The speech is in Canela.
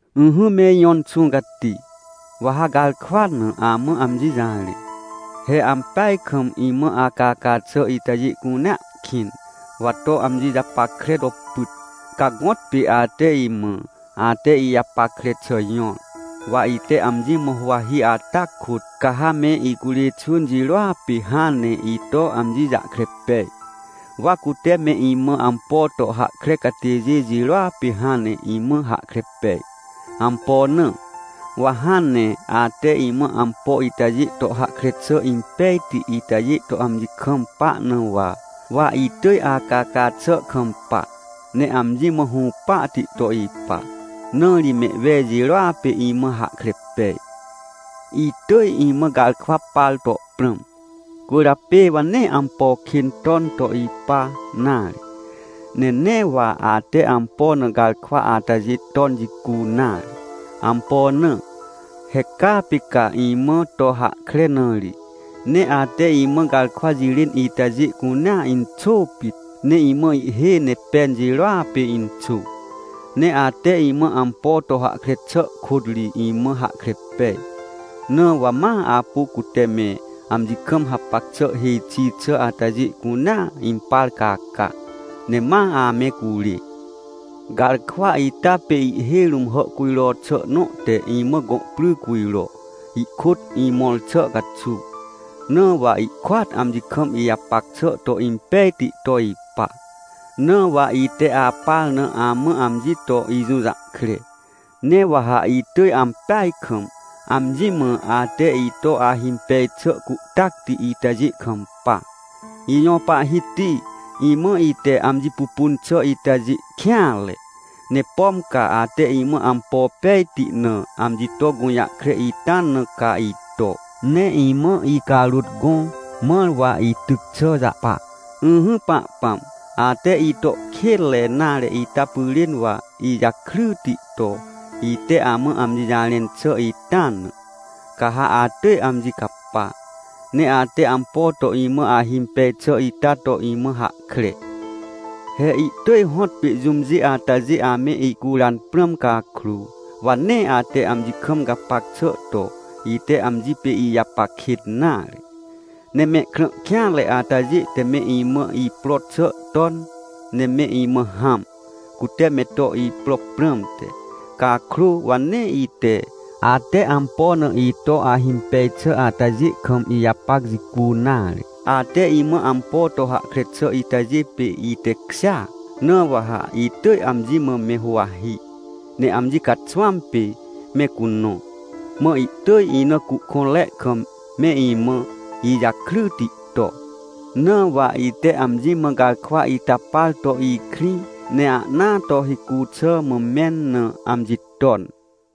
Ỹhỹ me ijõ Inxũ Cati, wa ha garkwa na amã amji jarẽ. He ampeaj kam imã acaca xà itajê cunea kĩn! Wa to amji japackrea to pyt. Ca gõtpê ate imã, ate ijapackre xà jõr, wa ite amji mã huwahi ata kôt, ca ha me icurê xwỳn jirôa pê hãn ne ito amji jahkre pej. Wa cute me imã ampo to hahkre catêjê jirôa pê hãn ne imã hahkre pej. Ampo na? Wa hãn ne ate imã ampo itajê to hahkre xà impejti itajê to amji kampa na wa. Wa itỳj acaca xà kampa, ne amji mã hũpahti to ipa, na ri mehwej jirôa pê imã hahkre pej. Itỳj imã garkwa par to prãm, cwỳrjapê wa nee ampo kên ton to ipa nare. Ne nee wa ate ampo na garkwa atajê ton jicu nare. Ampo na? He caa pê ca imã to hahkre na ri. Ne ate imã garkwa jirên itajê cunea inxô pit! Ne imã ihhêj ne pen jirôa pê inxô. He ate imã ampo to hahkre xà kôt ri imã hahkre pej, na wa ma apu cute me amji kam hapac xà hêj xi xà atajê cunea impar caca, ne ma ame curê. Garkwa ita pê ihhêj rũm hàhcujro xà nõ te imã gõ pry cujro, ihkôt imõr xà caxuw. Na wa ihkôat amji kam ijapac xà to impejti to ipa. Na wa ite apar na amã amji to ijũjahkre, ne wa ha itỳj ampeaj kam, amji mã ate ito ahimpej xà cuhtacti itajê kampa! Ijõ Pahhiti, imã ite amji pupun xà itajê kêanre! Ne pom ca ate imã ampo pejti na amji to gũjahkre ita na ca ito, ne imã icarôt gõ, mãr wa ityc xà jahpa. Ỹhỹ, Pahpãm, ate ito kênre nare ita pyrên wa ijakryti to, ite amã amji jarẽn xà ita na, ca ha atỳj amji capa, ne ate ampo to imã ahimpej xà ita to imã hahkre. He ihtỳj hõtpê jũmjê atajê ame icuran prãm cakrô, wa nee ate amji kam gapac xà to, ite amji pê ijapac kêt nare. Ne mehkrã kêanre atajê te me imã ipro xà ton, ne me imã hãm, cute me to ipro prãmte, cakrô wa nee ite, ate ampo na ito ahimpej xà atajê kam ijapac jicu nare. Ate imã ampo to hahkre xà itajê pê itekjêa. Na wa ha itỳj amji mã me huwahi, ne amji caxwãm pê me cunõ, mã ihtỳj ina cuhkõnre kam me imã ijakryti to. Na wa ite amji mã garkwa ita par to ikrĩ, ne ahnaa to hicu xà mã mẽn na amji ton.